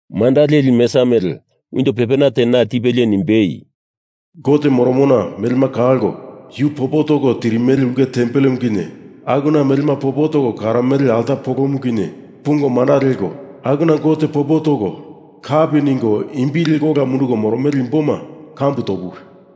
Manda leli mesa mele unjo pepena te na tipelie nimbei, “Gote moromona melema kalko yu popo toko tirimele ulke tempelemu kinye akuna melema popo toko karomele alta polomu kinye pungo manda leko, akuna Gote popo toko kapi ningo imbi liko ola mundunduko moromele imboma kambu topuwi!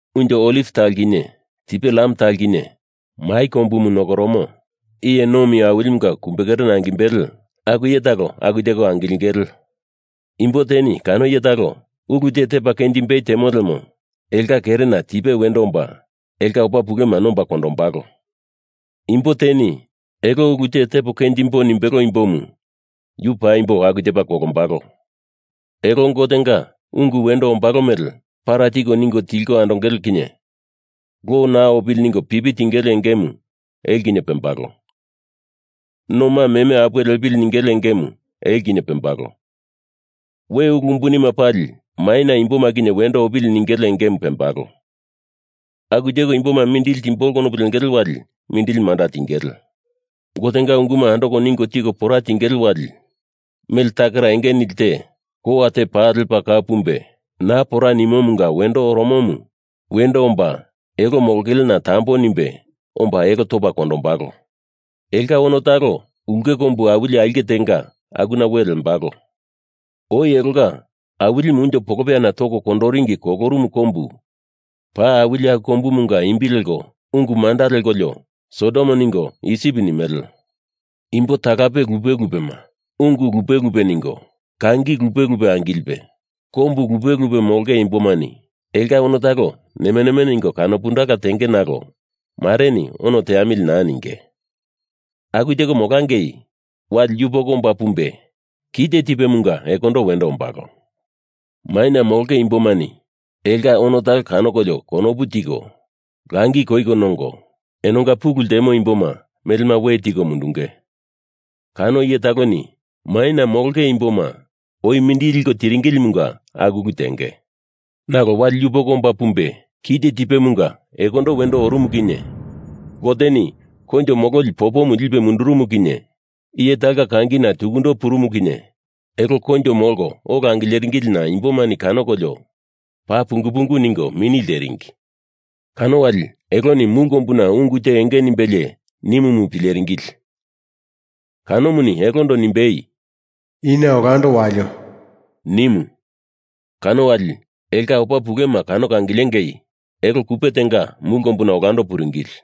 Unjo oliv talo kinye tipe lam talo kinye mai kombumu nokoromo Iye Nomi Awilimunga kumbekerena angimbele aku iye talo aku teko angilingele. Imbo teni kano iye talo ulu te tepa kenjimbei temo lemo elonga kerena tipe wendo omba elonga opa pulema nomba kondombalo. Imbo teni elo ulu te tepo kenjembo nimbelo imbomu yu paimbo aku tepa kolombalo. Elo Gotenga ungu wendo ombalo mele para tiko ningo tilko andongele kinye lo naa opili ningo pipi tingele engemu elo kinye pembalo. Noma meme apuwe lepili ningele engemu elo kinye pembalo. We ulu umbunima pali maina imboma kinye wendo opili ningele engemu pembalo. Aku teko imboma mindili timbolo konopu lengele wali mindili manda tingele. Gotenga unguma andoko ningo tiko pora tingele wali mele takera enge nili te kowa te paa lepa kau pumbe naa pora nimomunga wendo oromomu wendo omba elo molongelena tambo nimbe omba elo topa kondombalo. Elonga ono talo ulke kombu awili aulke tenga akuna we lembalo. Oi elonga Awilimu unjo polopeyana toko kondoringi kolorumu kombu paa awili aku kombumunga imbi leko ungu manda lekolio Sodom ningo Isip nimele. Imbo talape lupe lupema, ungu lupe lupe ningo, kangi lupe lupe angilipe, kombu lupe lupe molonge imbomani elonga ono talo nemeneme ningo kanopundala tenge nalo mareni ono teamili naa ninge. Aku teko molangei, wali yupoko omba pumbe kite tipemunga ekondo wendo ombalo. Maina molonge imbomani elonga ono talo kanokolio konopu tiko, langi koiko nongo, enonga pulu ltemo imboma melema we tiko mundunge. Kano iye taloni maina molonge imboma oi mindili liko tiringilimunga aku ulu tenge. Nalo wali yupoko omba pumbe kite tipemunga ekondo wendo orumu kinye Goteni koinjo mololi popomu lipe mundurumu kinye iye talonga kangina tukundo purumu kinye elo koinjo molko ola angileringilina imbomani kanokolio paa pungu pungu ningo mini lteringi. Kano wali eloni mulu kombuna ungu te enge nimbelie nimumu pileringili. Kanomuni elondo nimbei, “Ina olando walio!” nimu. Kano wali elonga opa pulema kanoko angilengi elo kupe tenga mulu kombuna olando puringili.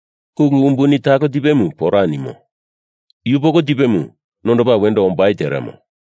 Ulu umbuni talo tipemu pora nimo. Yupoko tipemu nondopa wendo ombai teremo.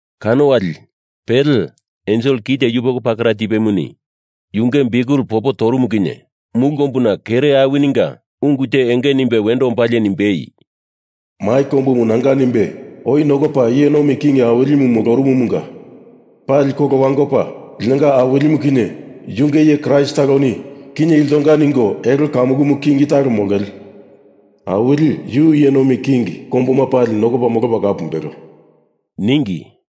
Kano wali pele ensel kite yupoko pakera tipemuni yunge biukel popo torumu kinye mulu kombuna kere awininga ungu te enge nimbe wendo ombalie nimbei, “Mai kombumu nanga nimbe oi nokopa iye nomi king awilimu molorumumunga pali kolo wangopa linonga Awilimu kinye yunge iye Kraist taloni kinye iltonga ningo elo kamukumu king talo molongele. Awili, yu iye nomi king kombuma pali nokopa molopa kau pumbelo,” ningi.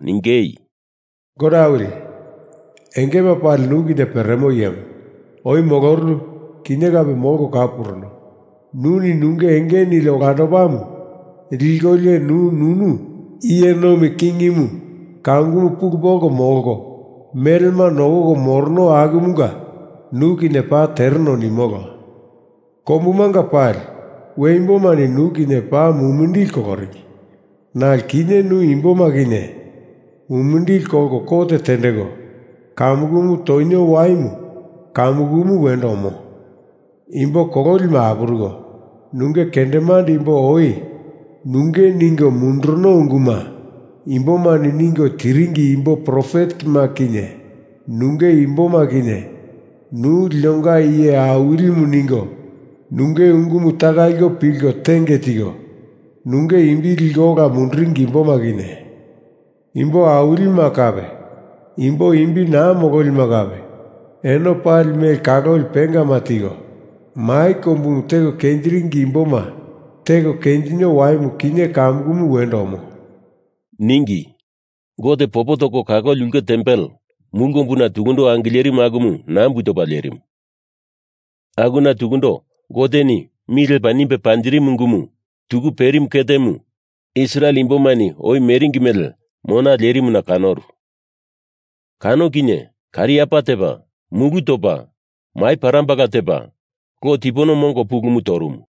ningei, “Gote awili, Engema Pali Nu Kinye Peremo Iyemu, oi molorunu, kinye kape molko kau puruno, nuni nunge enge nili olandopamu likolio nu nunu iye nomi kingimu kamukumu pulu polko molko melema nokoko morono akumunga nu kinye paa tereno nimolo. Kombumanga pali we imbomani nu kinye paa mumindili koloringi nalo kinye nu imboma kinye mumindili kolko kot tendeko kamukumu tonio waimu kamukumu wendo omo. Imbo kololima apuruko, nunge kendemande imbo oi nunge ningo munduruno unguma imboma ningo tiringi imbo profetema kinye nunge imboma kinye Nu linonga iye Awilimu ningo nunge ungumu taka liko pilko tenge tiko nunge imbi liko ola munduringi imboma kinye, imbo awilima kape imbo imbi naa mololima kape eno pali mele kaloli pengama tiko, mai kombumu teko kenjiringi imboma teko kenjinio waimu kinye kamukumu wendo omo,” ningi. Gote popo toko kaloli ulke tempel mulu kombuna tukundo angilerimu akumu nambu topa lerimu, akuna tukundo Goteni mi lepa nimbe panjirimu ungumu tuku perimu ketemu Israel imbomani oi meringi mele mona lerimuna kanoru. Kano kinye kariapa tepa, mulu topa, mai parambala tepa, lo tipono mongo pulumu torumu.